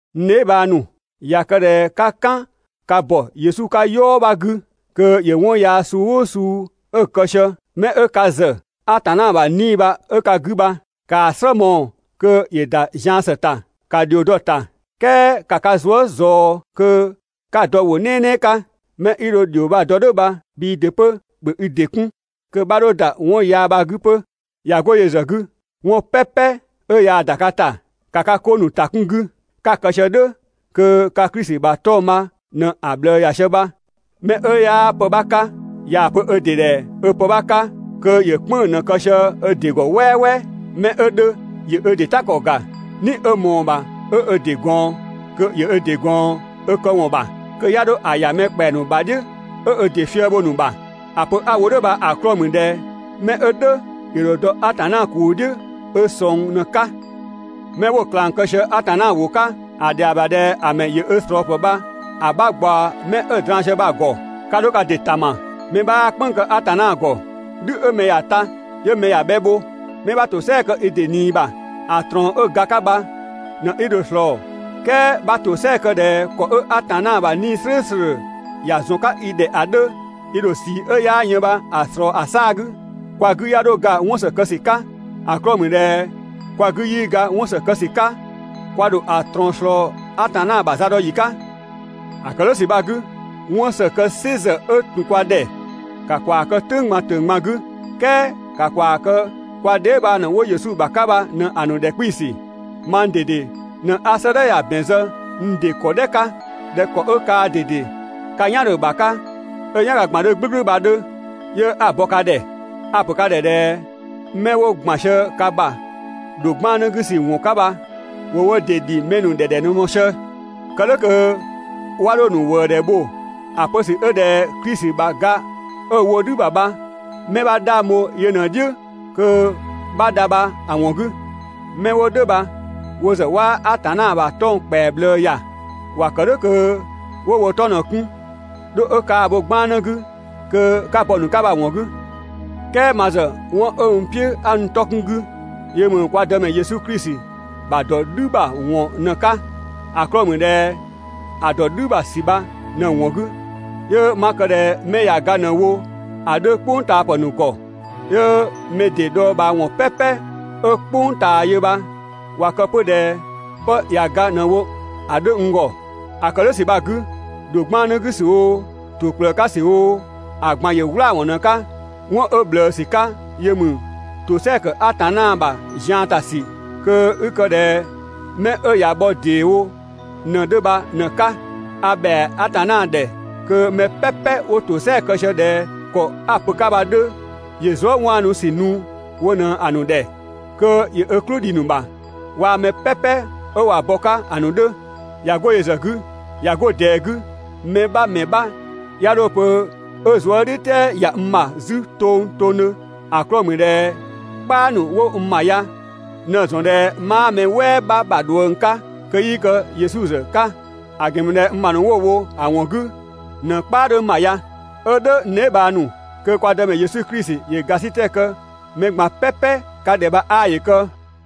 N dheebhang ‑nu, ꞊ya kë ꞊dhɛ 'ka "kan ka ‑bɔ Yesu 'ka "yɔɔ 'bha 'gü kö ‑yö 'wɔn yaa suu "ʋʋ suu 'ö kë sië, 'mɛ 'ö ka ‑zë Atanna ‑bha 'Nii‑ bha 'ö ka 'gü bha, ‑kaa "slë mɔɔ‑ kö ‑yö ‑da zian ‑së ‑ta, ‑ka ‑dhio dɔ‑ ‑ta, "kɛɛ ‑ka ka zuë" ꞊zɔɔ kö 'ka‑ dɔ ‑wʋ "nɛɛnɛɛ 'ka. 'Mɛ 'i dho‑ ‑dhio bha‑ dɔ "dhʋ̈ bha bhii ‑dɩ 'pö ‑bhö i ‑dɩ 'kun, kö 'bha 'dho ‑da 'wɔn yaa bha‑ 'gü 'pö. ꞊Ya 'go yö ‑zë 'gü, 'wɔn "pɛpɛ 'ö yaa‑ ‑da ka ‑ta, ‑ka ka 'ko ‑nu ‑ta 'kun‑ 'gü. 'Ka‑ kë sië "dhʋ̈ kö ka Klisi ‑bha 'tɔng‑ bha ꞊në‑ ꞊bhlëë ‑ya sië bha. Mɛ 'ö 'yaa pë 'bha 'ka, ꞊yaa‑ pö ö ‑dɩ ‑dhɛ 'ö pë 'bha 'ka, kö ‑yö "kpënng‑ ꞊në‑ ‑kë sië ö ‑dɩ ‑gɔ "wɛɛwɛɛ. 'Mɛ 'ö 'dhö ‑yö ö ‑dɩ "ta ‑kɔ ‑ga, "ni 'ö ꞊mɔɔ‑ ‑bha 'ö ö ‑dɩ ꞊gɔɔn, kö ‑yö ö ‑dɩ ꞊gɔɔn 'ö këwɔn ‑bha, kö 'ya 'dho‑ ‑ya mɛ ‑kpɛa ‑nu ‑bha "dhiʋ̈ 'ö ö ‑dɩ fië‑ bho‑ ‑nu ‑bha. ‑A pö 'a‑ wo "dhʋ̈ bha‑ 'klɔɔ‑ ‑mü ꞊dhɛ 'mɛ 'ö "dhʋ̈ ‑yö ‑dho dɔ Atanna ‑kuu "dhiʋ̈ ö ꞊sɔng ꞊në‑ 'ka. Mɛ 'wo‑ ꞊klang kë sië Atanna ‑wʋ 'ka, ‑a ‑dhɛa ‑bha ꞊dhɛ ‑a ‑mɛ ‑yö ö ꞊slɔɔpë bha‑ 'bha ꞊gbaɔ 'mɛ 'ö‑ draan‑ sië bha‑ ‑gɔ. 'Ka 'dho ka ‑dɩ ‑tama, mɛ 'bhaa "kpënng‑ kë Atanna ‑gɔ. "Dhü 'ö mɛ ‑ya ta 'yö mɛ ‑ya bhɛ bho. 'Mɛ 'bha ‑tosɛa kë i ‑dɩ ꞊nii ‑bha, ‑a ꞊trɔɔn 'ö ga 'ka bha ꞊në 'i dho‑ ꞊slɔɔ. "Kɛɛ 'bha ‑tosɛa kë ꞊dhɛ ‑kɔ 'ö Atanna ‑bha 'Nii‑ "slʋ̈ʋ̈slʋ̈ ‑ya ‑zɔn 'ka i ‑dhɛ ‑a 'dhö, i ‑dho ꞊sii 'ö 'yaa yën bha‑ ꞊slɔɔ ‑a 'saa‑ 'gü. Kwa 'gü 'ya 'dho ga 'wɔn ‑së kë ‑sü 'ka. ‑A 'klɔɔ‑ ‑mü ꞊dhɛ kwa 'gü 'yii ga 'wɔn ‑së kë ‑sü 'ka, kwa ‑dho ‑a ꞊trɔɔn ꞊slɔɔ Atanna ‑bha zadɔyi 'ka. ‑A ‑kë "dhʋ̈ ‑sü bha‑ 'gü, 'wɔn ‑së kë "sɩ ‑zë 'ö ‑tun kwa ‑dhɛ, ‑ka ‑kwaa kë "tʋ̈ng ꞊gban ‑tʋ̈ng ꞊gban 'gü, "kɛɛ ‑ka ‑kwaa kë kwa dheebhang ‑nu 'wo Yesu ‑bha 'ka bha ꞊në‑ ‑nu ‑dhɛ 'kpiisü. Mang ꞊dede ꞊në 'a 'sëëdhɛ ya‑ ‑bɛn zë n ‑dɩ ‑kɔ "dhɛ 'ka ꞊dhɛ ‑kɔ 'ö kaa ꞊dede ka "yan 'dhö‑ ‑bha 'ka 'ö‑ "yanga ꞊gban 'dhö "gblʋ̈gblʋ̈ bha‑ 'dhö 'yö 'a‑ bɔ ka ‑dhɛ bha. A‑ ‑pö ka ‑dhɛ ꞊dhɛ 'mɛ 'wo ‑gban sië ka ‑bha ‑dho 'gbannë 'gü ‑wɔn 'ka bha ‑wo wo ‑dɩ ‑dhi mɛ ‑nu ‑dhɛ ‑dhɛ ꞊në‑ mɔɔ‑ sië, kë "dhʋ̈ kö 'wa 'dho‑ ‑nu ‑wëëdhɛ bho ‑a pö ‑sü 'ö ꞊dhɛ Klisi ‑bha ga 'ö‑ wo "dhü ‑bha bha 'mɛ 'bha 'dhang bho yö ꞊në‑ "dhiʋ̈ kö 'bha dha bha‑ ‑wɔn 'gü. 'Mɛ 'wo "dhʋ̈ bha wo ‑zë 'waa Atanna ‑bha 'tɔng‑ ‑kpɛa ꞊bhlëë ‑ya, ‑wa ‑kë "dhʋ̈ kö 'wo wo 'tɔ ꞊në‑ 'kun ('dho 'ö kaa‑ bho 'gbannë 'gü kö 'ka bɔ‑ ‑nu 'ka bha‑ ‑wɔn 'gü). "Kɛɛ ma ‑zë 'wɔn 'ö n "piʋ̈ 'a n 'tɔ 'kun‑ 'gü yö ‑mü kwa Dëmɛ Yesu Klisi ‑bha ‑dɔ "dhü ‑bha ‑wɔn bha ꞊në‑ 'ka. ‑A 'klɔɔ‑ ‑mü ꞊dhɛ ‑a ‑dɔ "dhü ‑bha ‑sü bha ꞊në‑ ‑wɔn 'gü, 'yö 'ma kë ꞊dhɛ 'mɛ ꞊ya ga ꞊në‑ wo ‑a 'dhö "kpʋngtaapë ‑nu ‑gɔ, 'yö (mɛ ‑dɩ dhɔɔbhaawɔn "pɛpɛ 'ö "kpʋng ꞊taa yö bha), ꞊wa kë 'pö ꞊dhɛ 'pë ꞊ya ga ꞊në‑ wo‑ 'dhö n ‑gɔ. ‑A ‑kë "dhʋ̈ ‑sü bha‑ 'gü, ‑dho 'gbannë 'gü ‑sü oo, ‑to ‑kplëë 'ka ‑sü oo, ‑a ꞊gban ‑yö "wlaawɔn ꞊në‑ 'ka. 'Wɔn 'ö ꞊bhlëëwɔn 'ka yö ‑mü (‑tosɛa ‑kë Atanna ‑bha ‑zian ‑ta ‑sü kö 'i kë) ꞊dhɛ 'mɛ 'ö ꞊ya bhɔ ‑dee wo ꞊në‑ 'dhö bha ꞊në‑ 'ka. A ‑bhɛa Atanna ‑dhɛ kö mɛ "pɛpɛ wo ‑tosɛa kë sië ꞊dhɛ ‑kɔ 'a‑ pö‑ 'ka bha‑ 'dhö, ‑yö zuëwaanusü nu wo ꞊në‑ ‑nu ‑dhɛ, kö ‑yö ö "klʋ‑ dhi‑ ‑nu ‑bha, waa‑ mɛ "pɛpɛ 'ö ꞊wa bɔ‑ 'ka ‑a ‑nu 'dhö. ꞊Ya 'go yö ‑zë 'gü, ꞊ya 'go ꞊dɛɛ 'gü mɛ 'bha ‑mɛ 'bha 'ya 'dho‑ pö 'ö zuëdhiʋ̈tɛɛ ‑ya n ‑bha 'zü tongtongdhö, ‑a 'klɔɔ‑ ‑mü ꞊dhɛ "kpaa ‑nu 'wo n ‑bha ya ꞊në‑ ‑zɔn ꞊dhɛ 'maa mɛ "wɛɛ 'bha ‑bha ꞊dhuëng 'ka kö 'yii kë Yesu ‑zë 'ka (‑a ‑gɛn ‑mü ꞊dhɛ ma ‑nu 'wo‑ bho‑ ‑wɔn 'gü ꞊në‑ "kpaa 'dhö n ‑bha ya!). 'Ö "dhʋ̈ n dheebhang ‑nu, kö kwa Dëmɛ Yesu Klisi ‑yö ‑gasitɛ kë mɛ ꞊gban "pɛpɛ ka ‑dhɛ bha 'aa ‑yö kë.